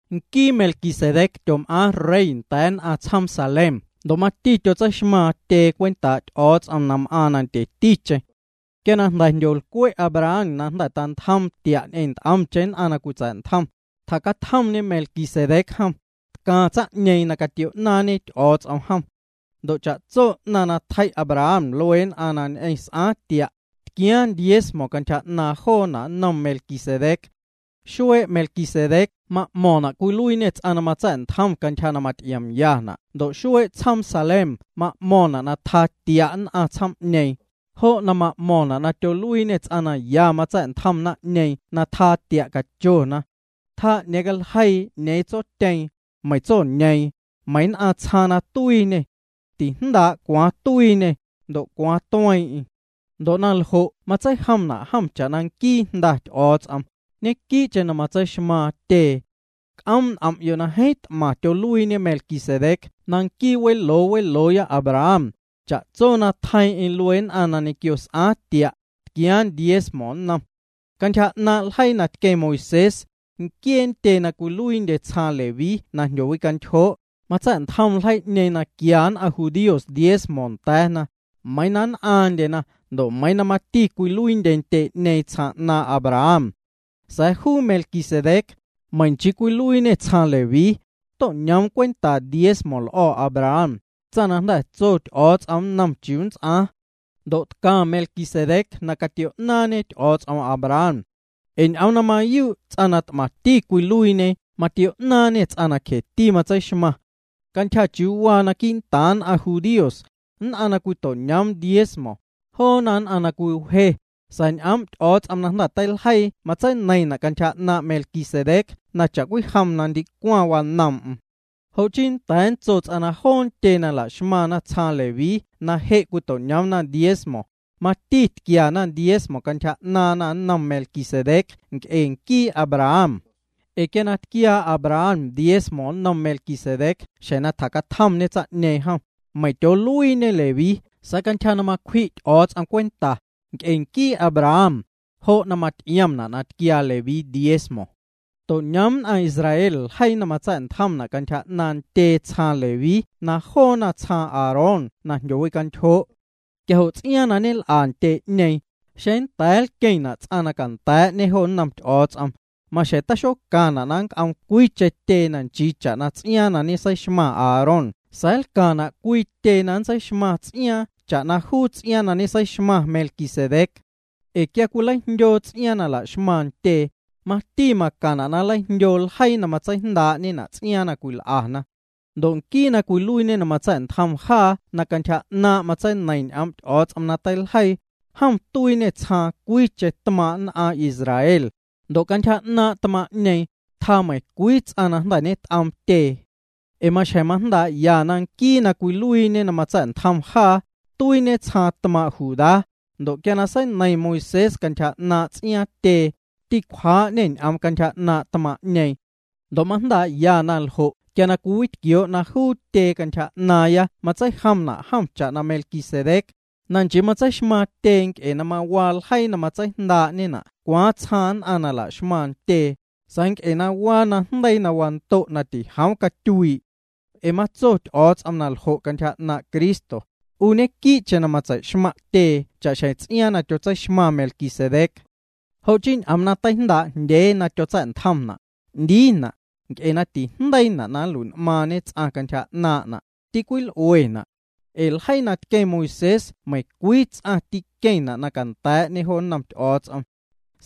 Nquii Melquisedec tyom'aaⁿ rey nda̱a̱ nn'aⁿ tsjoom Salem ndo' mati tyotseixmaaⁿ tyee cwentaa' Ty'o̱o̱ts'om na m'aaⁿ na ndyeticheⁿ. Quia na jndyolcwe' Abraham jnda̱ na tantjoom tia' ñ'eⁿ nt'omcheⁿ nn'aⁿ na cwitsa̱'ntjom, tjacatjomñe Melquisedec jom, tcaⁿ tsaⁿ'ñeeⁿ na catio'naaⁿñe Ty'o̱o̱ts'om jom. Ndo' cha'tso 'naⁿ na tjei' Abraham luee nn'aⁿ ñ'eⁿ na s'aaⁿ tia', tquiaaⁿ diezmo cantyja 'naaⁿ joo jo' nnom Melquisedec. Xuee' Melquisedec ma'mo̱ⁿna' na cwiluiiñê ts'aⁿ na matsa̱'ntjom cha'xjeⁿ na maty'iomyana' ndo' xuee' tsjoom Salem ma'mo̱ⁿna' na tjaa tia' nn'aⁿ tsjoom'ñee, jo' ma'mo̱ⁿna' na tyoluiiñê ts'aⁿ na ya matsa̱'ntjoom naⁿ'ñeeⁿ na tjaa tia' cachona. Tijndaa' meiⁿ tsotyeeⁿ, meiⁿ tsoñeeⁿ, meiⁿ cwaaⁿ nn'aⁿ tsjaaⁿ na tuiiñê. Tijndaa' cwaaⁿ na tuiiñê, meiⁿ cwaaⁿ na tueeⁿ'eⁿ. Ndo' na ljo' ñequii'cheⁿ matseijomna' jom cha'na nquii Jnda Ty'o̱o̱ts'om, ñequii'cheⁿ matseixmaaⁿ tyee. C'oom' n'om'yo' na jeeⁿ t'maⁿ tyoluiiñe Melquisedec na nquii weloo welooya Abraham, cha'tso na tjeiiⁿ'eⁿ luee nn'aⁿ na ñequio s'aaⁿ tia', tquiaaⁿ diezmo nnom. Cantyja 'naaⁿ' ljeii na tqueⁿ Moisés, nquiee ntyee na cwiluiindye tsjaaⁿ Leví na jndyowicantyjoo', matsa̱'ntjom ljeii'ñeeⁿ na quia nn'aⁿ judíos diezmo nda̱a̱na, meiiⁿ na nn'aaⁿndyena ndo' mati cwiluiindye ntyee'ñeeⁿ tsjaaⁿ 'naaⁿ' Abraham. Sa̱a̱ juu Melquisedec, meiⁿ nchii cwiluiiñê tsjaaⁿ Leví jom, to'ñoom cwenta diezmo l'o̱ Abraham, tsaⁿ na jnda̱ tso Ty'o̱o̱ts'om nnom chiuu nnts'aaⁿ. Ndo' tcaⁿ Melquisedec na catio'naaⁿñe Ty'o̱o̱ts'om Abraham. Ee ñ'oom na mayuu' ts'aⁿ na t'maⁿti cwiluiiñe matio'naaⁿñê ts'aⁿ na cjeti tseixmaⁿ. Cantyja 'naaⁿ' na waa quii'ntaaⁿ nn'aⁿ judíos, nn'aⁿ na cwito'ñoom diezmo, joona nn'aⁿ na cwiwje, sa̱a̱ ñ'oom' Ty'o̱o̱ts'om na jnda̱ teiljeii matseineiⁿna' cantyja 'naaⁿ' Melquisedec na cha'cwijom na ndicwaⁿ wanoom'm. Jo' chii nnda̱a̱ nntso ts'aⁿ na joo ntyee na la'xmaⁿna tsjaaⁿ Leví na je' cwito'ñoomna diezmo, mati tquiana diezmo cantyja 'naaⁿna nnom Melquisedec nc'e nquii Abraham. Ee quia na tquiaa Abraham diezmo nnom Melquisedec xjeⁿ na tjacatjomñe tsaⁿ'ñeⁿ jom, meiiⁿ na tyooluiiñe Leví sa̱a̱ cantyja na macwji' Ty'o̱o̱ts'om cwenta, nc'e nquii Abraham, jo' maty'iomna' na tquiaa Leví diezmo. To'ñoom nn'aⁿ Israel ljeii na matsa̱'ntjomna' cantyja 'naaⁿ' ntyee tsjaaⁿ Leví na joona tsjaaⁿ Aarón na jndyowicantyjoo'. Quia jo' ts'iaaⁿ na ñel'a ntyee'ñeeⁿ, xeⁿ nnda̱a̱ nlqueⁿna' ts'aⁿ na canda̱a̱'ñe jo nnom Ty'o̱o̱ts'om, maxjeⁿ taxocaⁿna' na nnc'oom cwiicheⁿ tyee na nchii cha'na ts'iaaⁿ na ñeseixmaⁿ Aarón sa̱a̱ nlcaⁿna' cwii tyee na nntseixmaⁿ ts'iaaⁿ cha'na juu na ñeseixmaⁿ Melquisedec. Ee quia na cwileijndyoo ts'iaaⁿ na la'xmaⁿ ntyee, mati macaⁿna' na nleijndyoo ljeii na matseijndaa'ñena' ts'iaaⁿ na cwil'ana. Ndo' nquii na cwiluiiñe na matsa̱'ntjom jaa na cantyja 'naaⁿ' matseineiⁿ ñ'oom' Ty'o̱o̱ts'om na teiljeii, jom tuiiñê tsjaaⁿ cwiicheⁿ tmaaⁿ' nn'aⁿ Israel, ndo' cantyja 'naaⁿ' tmaaⁿ'ñeeⁿ, tjaa meiⁿ ncwii ts'aⁿ na jnda̱ ñet'oom tyee. Ee maxjeⁿ majndaa'ya na nquii na cwiluiiñe na matsa̱'ntjom jaa, tuiiñe tsjaaⁿ tmaaⁿ' Judá, ndo' quia seineiⁿ Moisés cantyja 'naaⁿ' ts'iaaⁿ ntyee, ticwjaa'ñê ñ'oom cantyja 'naaⁿ nn'aⁿ tmaaⁿ'ñeeⁿ. Ndo' majndaa'ya na ljo' quia cwiwitquioo' na juu tyee cantyja 'naaⁿya matseijomna' jom cha'na Melquisedec, na nchii ñeseixmaaⁿ tyee nc'e na mawaa ljeii na matseijndaa'ñena' cwaaⁿ tsjaaⁿ nn'aⁿ nla'xmaⁿna ntyee, sa̱a̱ nc'e na waa najndeii na wando' na tijoom catyuii'. Ee matso Ty'o̱o̱ts'om na ljo' cantyja 'naaⁿ' Cristo: 'U ñequii'cheⁿ matseixmaⁿ' tyee cha'xjeⁿ ts'iaaⁿ na tyotseixmaⁿ Melquisedec. Jo' chii ñ'oom na teijndaa'jndyee na tyotsa̱'ntjomna', 'ndiina', nc'e na tijndeiina' na nlui'n'maaⁿñe ts'aⁿ cantyja 'naaⁿ'na', ticwil'uena'. Ee ljeii na tqueⁿ Moisés meiⁿcwii ts'aⁿ tîqueⁿna' na canda̱a̱'ñe jo nnom Ty'o̱o̱ts'om.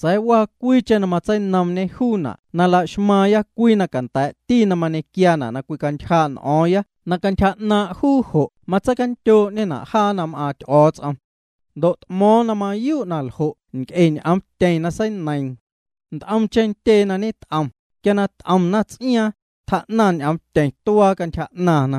Sa̱a̱ waa cwiicheⁿ na matseinoomñe juuna' na la'xmaaⁿya cwii na canda̱a̱'ti na mañequiaana' na cwicantyjaa' n'o̱o̱ⁿya na cantyja 'naaⁿ' juu jo' matseicandyoo'ñena' jaa na m'aaⁿ Ty'o̱o̱ts'om. Ndo' t'mo̱o̱ⁿ na mayuu' na ljo' nc'e ñ'oomtyeⁿ na seineiiⁿ. Nt'omcheⁿ ntyee na ñet'om, quia na t'omna ts'iaaⁿ, tjaa'naⁿ ñ'oomtyeⁿ tuaa cantyja 'naaⁿna.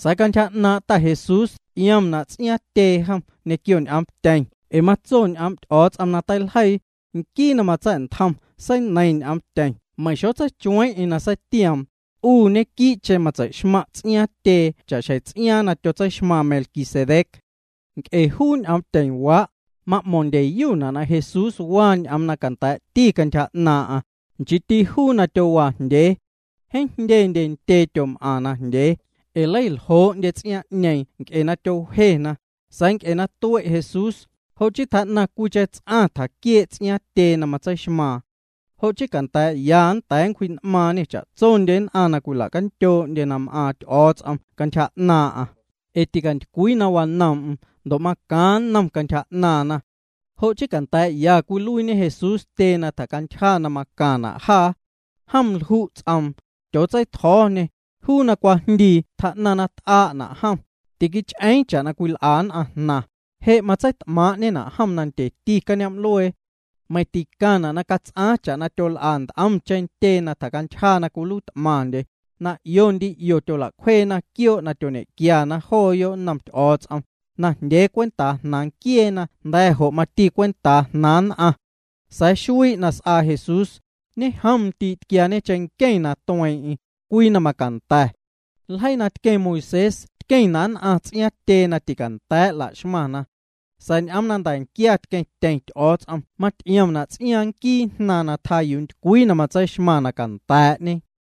Sa̱a̱ cantyja 'naaⁿ' Ta Jesús ty'iomna' ts'iaaⁿ tyee jom ñequio ñ'oomtyeⁿ ee matso ñ'oom' Ty'o̱o̱ts'om na teiljeii: Nquii na matsa̱'ntjom seineiiⁿ ñ'oomtyeⁿ meiⁿ xotseichueiiⁿ'eⁿ na seitioom: “'U ñequii'cheⁿ nntseixmaⁿ' ts'iaaⁿ tyee cha'xjeⁿ ts'iaaⁿ na tyotseixmaⁿ Melquisedec.” Nc'e juu ñ'oomtyeⁿwaa', ma'mo̱ⁿndyeyuna' na Jesús waa ñ'oom na canda̱a̱'ti cantyja 'naaⁿ'aⁿ, nchiiti juu na tyowaajndyee. Jeeⁿ jndyendye ntyee na tyom'aⁿ najndyee, ee leicaljoo'ndye ts'iaaⁿ'ñeeⁿ nc'e na tyowjena, sa̱a̱ nc'e na ticue' Jesús, jo' chii tjaa'naⁿ cwiicheⁿ ts'aⁿ tjaquiee' ts'iaaⁿ tyee na matseixmaaⁿ. Jo' chii canda̱a̱'ya nnda̱a̱ nncwji'n'maaⁿñê cha'tsondye nn'aⁿ na cwila'candyoo'ndyena na m'aaⁿ Ty'o̱o̱ts'om cantyja 'naaⁿ'aⁿ, ee ticantycwii na wanoom'm ndo' na macaaⁿ nnom cantyja 'naaⁿna. Jo' chii canda̱a̱'ya cwiluiiñe Jesús tyee na tjacantyja na macaⁿna' jaa. Jom lju' ts'oom, tyootseitjo̱o̱ñê, juu na cwajndii tjaa'naⁿ na t'aa'na' jom, tiquich'eeⁿ cha'na cwil'a nn'aⁿ jnaⁿ, je' matseit'maaⁿ'ñena' jom nandyeti cañoom'luee. Meiⁿ ticaⁿna' na cats'aaⁿ cha'na tyol'a nt'omcheⁿ ntyee na tjacantyja tyoluiit'maⁿndye, na 'io ndii 'io tyola'cwjeena quioo' na tyoñequiana jooyo' nnom Ty'o̱o̱ts'om, najndyee cwentaa jnaaⁿ nquieena ndo' nda̱ jo' mati cwentaa jnaaⁿ nn'aⁿ. Sa̱a̱ xuii' na s'aa Jesús, ñejomndii' tquiaañe cheⁿnqueⁿ na tueeⁿ'eⁿ, cwii na macanda̱. Ljeii na tqueⁿ Moisés tqueⁿna' nn'aⁿ ts'iaaⁿ ntyee na ticanda̱a̱' la'xmaⁿna. Sa̱a̱ ñ'oom na nda̱nquia tqueⁿtyeⁿ Ty'o̱o̱ts'om maty'iomna' ts'iaaⁿ nquii Jnaaⁿ na tjaa yuu ntycwii na tseixmaaⁿ na canda̱a̱'ñê.